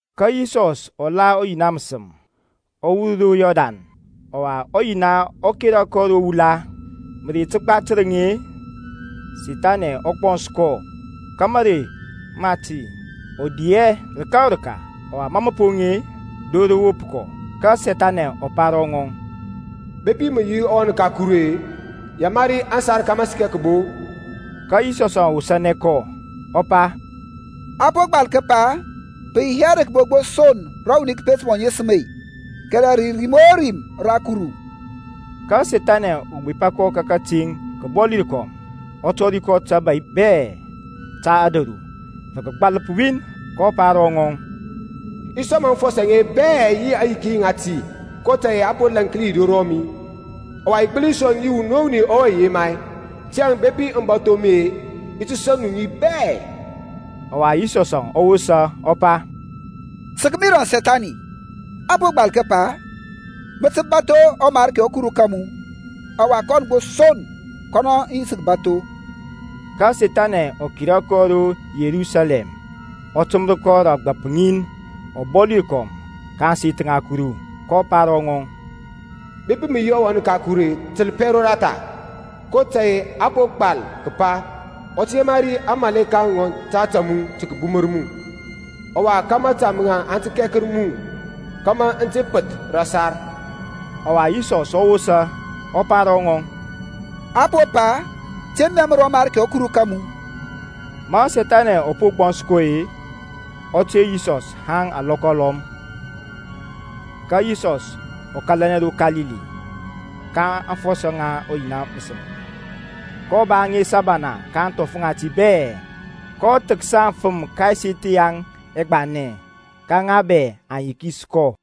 Ka Yisɔs ɔ la ɔYina məsəm, ɔ wur ro Yɔrdan, ɔwa ɔYina ɔ kera kɔ ro wula, Mərey təgba tərəŋ-e, Sethani ɔ gbɔns kɔ. Ka mȧrey mati ɔ di hɛ rəka o rəka, ɔwa ma mə poŋ-e, dor rə wop kɔ. Ka Sethani ɔ pa ro ŋɔŋ, Bepi mə yi ɔWan ka Kuru-e, yamari aŋsar aŋe kȧmȧ aŋ səkɛ kəbo. Ka Yisɔs ɔ wosȧnɛ kɔ, ɔ pa, A po gbal kəpa, Pə yi hɛ rə kəbo gbo son rə wuni kəpet mɔ ŋesəm-e, kɛrɛ rə rim o rim ra Kuru. Ka Sethani ɔ gbepa kɔ ka kəteŋ kəbɔli rəkɔm, ɔ tɔri kɔ tabȧy bɛ ta ȧdȧru rə kəgbȧləp win. kɔ pa ro ŋɔŋ, I ti sɔŋ mu aŋfɔsɔ aŋe bɛ yi aŋyiki ŋati, kotȧy-e a po laŋklia ŋi ro rɔmi; ɔwa i gbəli sɔŋ ŋi wuni o wuni ɔwe i yema. Tiyȧŋ bepi mə bȧtho mi-e, i ti sɔŋ mu ŋi bɛ. Ɔwa Yisɔs ɔ wosa ɔ pa, Sək mi rȧŋ Sethani. A po gbal kəpa, Mə tə bȧtho ɔMarki ɔKuru ka mu, ɔwa kɔn son kɔnɔ mə yi tə kəbȧtho. Ka Sethani ɔ kera kɔ ro Yerusalɛm, ɔ təmər kɔ rə ȧgbȧp ŋin ɔbɔli rəkɔm ka ȧŋseth ŋa Kuru, kɔ pa ro ŋɔŋ, Bepi mə yi ɔWan ka Kuru-e təlpɛ roratha; kotȧy-e a po gbal kəpa, Ɔ tə yamari aŋmȧleka ŋɔŋ ta ȧtȧ mu, tə kəbumər mu, ɔwa Ka mȧta maŋ aŋ tə kɛkər mu Kama mə te pəth rə ȧsar. Ɔwa Yisɔs ɔ wosa, ɔ pa ro ŋɔŋ, A po pa, Te mɛmər ɔMarki ɔKuru ka mu. Ma Sethani ɔ poŋ ɛgbɔns bɛ-e, ɔ ter Yisɔs haŋ alɔkɔ alɔm. Ka Yisɔs ɔ kȧlanɛ ro Kalili ka aŋfɔsɔ ŋa ɔYina məsəm, kɔ ba ŋes abana ka ȧŋthɔf ŋati bɛ. kɔ thəksa aŋfəm ka ɛseth yaŋ ɛgbanɛ, ka ŋa bɛ aŋ yikis kɔ.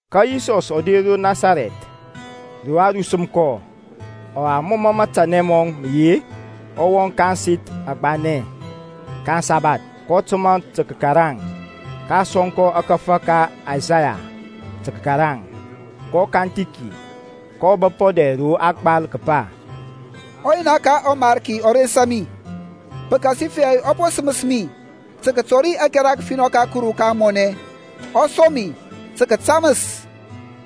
Ka Yisɔs ɔ der ro Nasarɛth rə a rusəm kɔ. Ɔwa mɔ mə matanɛ mɔŋ mə yi-e, ɔ wɔŋ ka ȧŋseth agbanɛ ka aŋsabath, kɔ təmȧ tə kəkaraŋ. Ka a sɔŋ kɔ ȧkȧfȧ ka Isaya tə kəkaraŋ. Ɔ kanthi ki, kɔ bəp ɔdɛr rə a gbal kəpa, ƆYina ka ɔMarki ɔ rensa mi, Pəkasifɛ ɔ po səməs mi tə kətɔri ȧkɛra kəfinɔ ka Kuru ka ȧŋmɔnɛ. Ɔ som mi tə kətaməs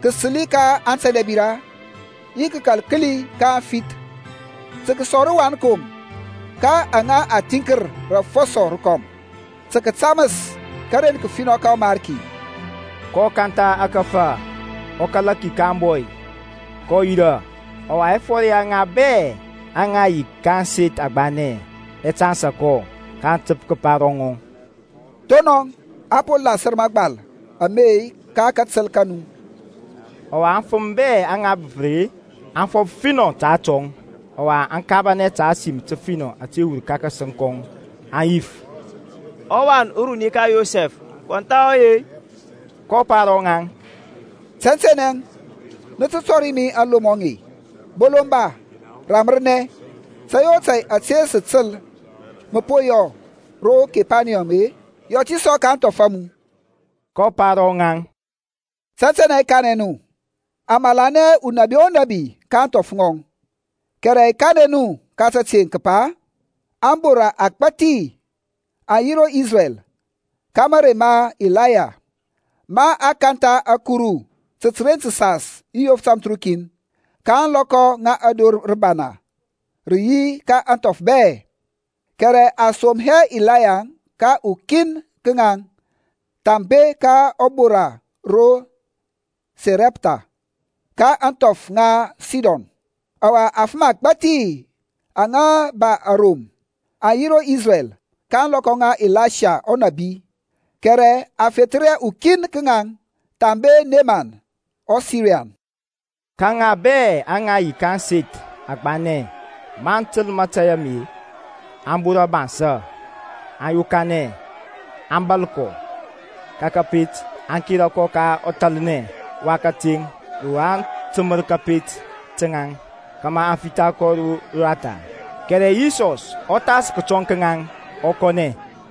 kasəli ka atɛndɛbira, Yi kakal kəli ka aŋfith, Tə kəsɔŋ rȧwankom ka aŋa a thiŋkər rə afɔsɔ rəkɔm. Tə kətaməs karen kəfinɔ ka ɔMarki. kɔ kantha ȧkȧfȧ, ɔ kala ki ka ȧŋbɔy, kɔ yirȧ. Ɔwa ɛfɔr ya ŋa bɛ aŋa yi ka ȧŋseth agbanɛ ɛ tansa kɔ. kɔ təp kəpa ro ŋaŋ, Thonɔŋ a po lasər mȧgbal ame ka katəl ka nu. Ɔwa aŋfəm bɛ aŋa bəpər-e, aŋ fɔf finɔ ta atɔŋ, ɔwa aŋ kabanɛ ta ȧsim təfinɔ ȧte wur ka kȧsəŋ kɔŋ; aŋ yif, Ɔwan uruni ka Yosɛf kɔn thahɔ ɔwe-i? kɔ pa ro ŋaŋ, Tɛntɛnɛ nə tə tɔri mi aŋlomɔ aŋe, Bolomba, ramərnɛ; tȧy o tȧy ȧte sə təl mə po yɔ ro Kepaniyɔm-e, yɔ ti sɔ nɔ ka ȧŋthɔf a mu. kɔ pa ro ŋaŋ, Tɛntɛnɛ i kanɛ nu, a malanɛ hɛ unabi o nȧbi ka ȧŋthɔf ŋɔŋ. Kɛrɛ i kanɛ nu ka təteŋ kəpa, Abora agbȧthi aŋ yi ro Isrɛl ka mȧrey ma Ilaya, ma a kantha ȧkuru təren təsas yi yof tamthərukin, ka ȧŋlɔkɔ ma dor rəbana rə yi ka ȧŋthɔf bɛ. Kɛrɛ a som hɛ Ilaya ka ukin ka ŋaŋ thambe ka ubora ro Sarɛptha, ka ȧŋthɔf ŋa Sidon. Ɔwa afəm agbȧthi aŋa ba arom aŋ yi ro Isrɛl ka ȧŋlɔkɔ ŋa Ilasha ɔnȧbi, kɛrɛ a fethər hɛ ukin ka ŋaŋ thambe Nemɔn ɔSirian. Ka ŋaŋ bɛ aŋa yi ka ȧŋseth agbanɛ maŋ təl mȧtȧy ame aŋ bora bansȧ, aŋ yokanɛ aŋ bȧl kɔ ka kȧpet, aŋ kera kɔ ka ɔthalnɛ wa kateŋ ro a təmər kȧpet ka ŋaŋ, kȧmȧ a fitha kɔ roratha. Kɛrɛ Yisɔs ɔ thas ka kətɔŋ ka ŋaŋ ɔ kɔnɛ.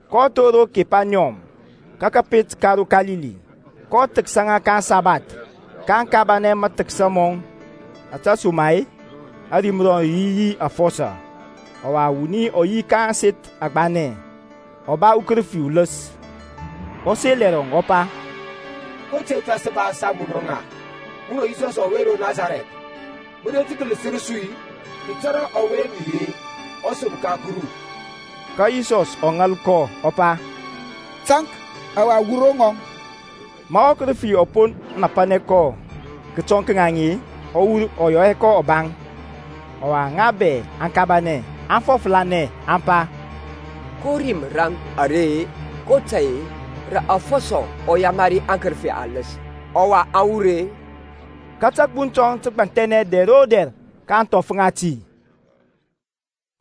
kɔ thor ro Kepaniyɔm, kəpet ka ro Kalili, kɔ thəksa ŋa ka aŋsabath. kaŋ kabanɛ mathəksa mɔŋ, ȧtesoma-e ȧrim rɔŋ rə yi yi afɔsɔ. Ɔwa wuni ɔ yi ka ȧŋseth agbanɛ, ɔ ba ukərəfi uləs, ɔ sel ɛrɔŋ, ɔ pa, Ko tȧy tȧŋ sə ba yi munɔŋ-a? Munɔ Yisɔs ɔwe ro Nasarɛth! Mə der tə kələsər su-i? I tȧrȧ ɔwe mə yi-e, ɔSəm ka Kuru. Ka Yisɔs ɔ ŋal kɔ, ɔ pa, Taŋk, ɔwa wur ro ŋɔŋ. Ma ɔkərəfi ɔ po napanɛ kɔ kətɔŋ ka ŋaŋ-e, ɔ wur, ɔ yɔ hɛ kɔ ɔbaŋ. Ɔwa ŋa bɛ aŋ kabanɛ, aŋ fɔflanɛ aŋ pa, Ko rim raŋ are-e, kotȧy-e, rə afɔsɔ ɔ yamari aŋkərəfi aləs, ɔwa aŋ wur-e? Ka tȧgbuŋ tɔŋ tə gbanthɛnɛ dɛr o dɛr ka ȧŋthɔf ŋati.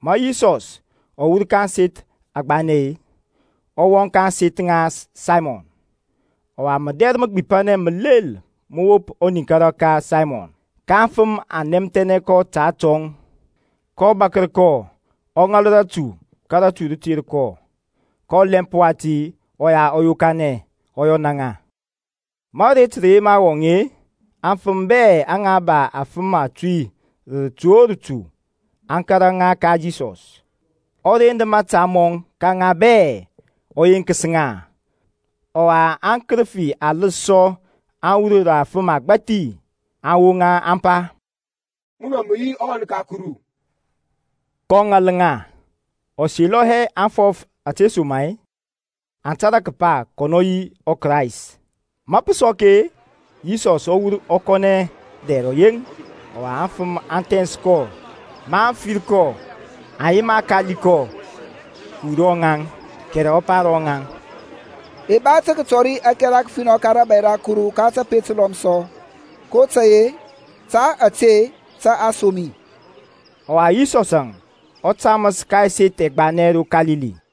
Ma Yisɔsȧŋ ɔ wur ka ȧŋseth agbanɛ-e, ɔ wɔŋ ka ȧŋseth ŋa Saymɔn. Ɔwa mədɛr məgbipanɛ məlel mə wop ɔniŋkara ka Saymɔn, ka aŋfəm aŋ nɛmthɛnɛ kɔ ta atɔŋ. kɔ bȧkər kɔ, ɔ ŋal ratu, ka rə ter kɔ. Ka ɔlɛmp wati ɔya ɔ yokanɛ ɔ yɔna ŋa. Ma aret rə yema wɔŋ-e, aŋfəm bɛ aŋa ba afəm atuy rə rətu o rətu, aŋ kȧrȧ ŋa ka Yisɔs; ɔ rend mȧta mɔŋ ka ŋa bɛ, ɔ yenkəs ŋa. Ɔwa aŋkərəfi aləs sɔ aŋ wur rə afəm agbȧthi, aŋ woŋa, aŋ pa, Munɔ mə yi ɔWan ka Kuru; kɔ ŋal ŋa, ɔ selɔyɛ aŋ fɔf ȧtesoma-e aŋ tȧrȧ kəpa kɔnɔ yi ɔKrayst. Ma pə sɔk-e, Yisɔs ɔ wur ɔ kɔnɛ dɛr ɔyeŋ. Ɔwa aŋfəm aŋ thɛns kɔ. Maŋ fir kɔ aŋ yema kali kɔ kəwur ro rɔŋaŋ. Kɛrɛ ɔ pa ro ŋaŋ, I ba tə kətɔri ȧkɛra kəfinɔ ka rȧbȧy ra Kuru ka tapet təlɔm sɔ, kotȧy-e ta ȧte tə a som mi. Ɔwa Yisɔsȧŋ ɔ taməs ka ɛseth ɛgbanɛ ro Kalili.